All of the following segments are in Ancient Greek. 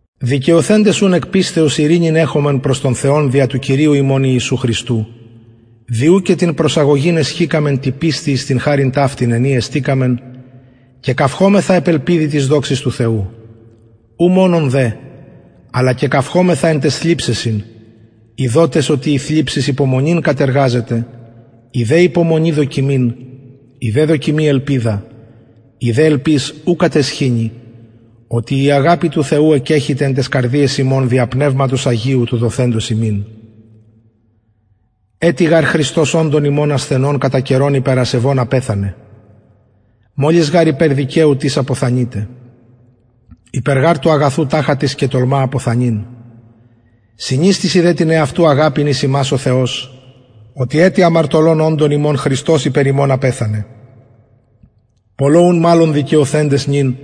δικαιωθεντες ουν εκ πιστεως ειρηνην εχομεν προς τον θεον δια του κυριου ημων ιησου χριστου δι ου και την προσαγωγην εσχηκαμεν τη πιστει εις την χαριν ταυτην εν η εστηκαμεν και καυχωμεθα επ ελπιδι της δοξης του θεου ου μονον δε αλλα και καυχωμεθα εν ταις θλιψεσιν ειδοτες οτι η θλιψις υπομονην κατεργαζεται η δε υπομονη δοκιμην η δε δοκιμη ελπιδα η δε ελπις ου καταισχυνει οτι η αγαπη του θεου εκκεχυται εν ταις καρδιαις ημων δια πνευματος αγιου του δοθεντος ημιν ετι γαρ χριστος οντων ημων ασθενων κατα καιρον υπερ ασεβων απεθανεν μολις γαρ υπερ δικαιου τις αποθανειται υπερ γαρ του αγαθου ταχα τις και τολμα αποθανειν συνιστησιν δε την εαυτου αγαπην εις ημας ο θεος οτι ετι αμαρτωλων οντων ημων χριστος υπερ ημων απεθανεν πολλω ουν μαλλον δικαιωθεντες νυν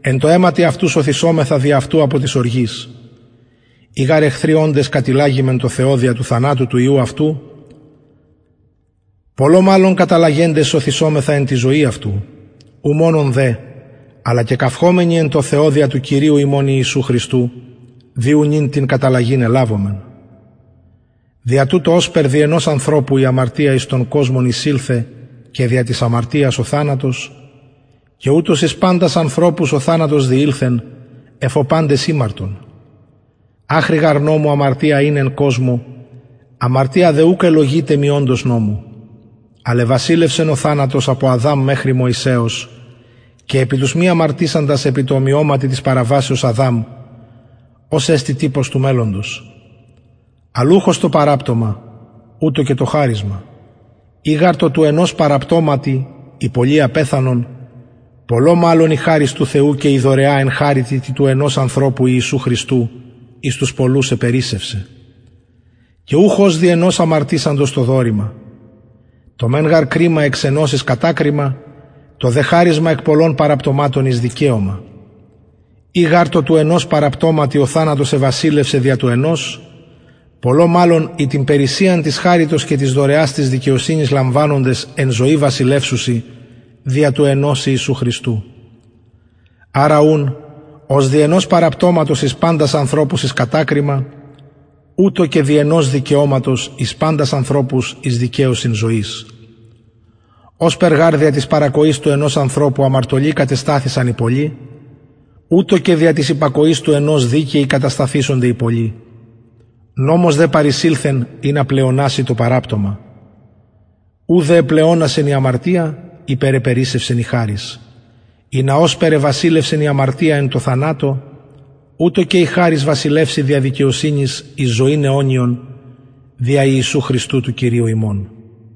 εν τω αιματι αυτου σωθησομεθα δι αυτου απο της οργης ει γαρ εχθροι οντες κατηλλαγημεν τω θεω δια του θανατου του υιου αυτου πολλω μαλλον καταλλαγεντες σωθησομεθα εν τη ζωη αυτου ου μονον δε αλλα και καυχωμενοι εν τω θεω δια του κυριου ημων ιησου χριστου δι ου νυν την καταλλαγην ελαβομεν δια τουτο ωσπερ δι ενος ανθρωπου η αμαρτια εις τον κοσμον εισηλθεν και δια της αμαρτιας ο θανατος και ουτως εις παντας ανθρωπους ο θανατος διηλθεν εφ ω παντες ημαρτον αχρι γαρ νομου αμαρτια ην εν κοσμω αμαρτια δε ουκ ελλογειται μη οντος νομου αλλ εβασιλευσεν ο θανατος απο αδαμ μεχρι μωυσεως και επι τους μη αμαρτησαντας επι τω ομοιωματι της παραβασεως αδαμ ος εστιν τυπος του μελλοντος αλλ ουχ ως το παραπτωμα ουτως και το χαρισμα ει γαρ τω του ενος παραπτωματι οι πολλοι απεθανον πολλω μαλλον η χαρις του θεου και η δωρεα εν χαριτι τη του ενος ανθρωπου ιησου χριστου εις τους πολλους επερισσευσεν και ουχ ως δι ενος αμαρτησαντος το δωρημα το μεν γαρ κριμα εξ ενος εις κατακριμα το δε χαρισμα εκ πολλων παραπτωματων εις δικαιωμα ει γαρ τω του ενος παραπτωματι ο θανατος εβασιλευσεν δια του ενος πολλω μαλλον οι την περισσειαν της χαριτος και της δωρεας της δικαιοσυνης λαμβανοντες εν ζωη βασιλευσουσιν δια του ενος ιησου χριστου αρα ουν ως δι ενος παραπτωματος εις παντας ανθρωπους εις κατακριμα ουτως και δι ενος δικαιωματος εις παντας ανθρωπους εις δικαιωσιν ζωης ωσπερ γαρ δια της παρακοης του ενος ανθρωπου αμαρτωλοι κατεσταθησαν οι πολλοι ουτως και δια της υπακοης του ενος δικαιοι κατασταθησονται οι πολλοι νομος δε παρεισηλθεν ινα πλεοναση το παραπτωμα ου δε επλεονασεν η αμαρτια υπερεπερισσευσεν η χαρις ινα ωσπερ εβασιλευσεν η αμαρτια εν τω θανατω ουτως και η χαρις βασιλευση δια δικαιοσυνης εις ζωην αιωνιον δια ιησου χριστου του κυριου ημων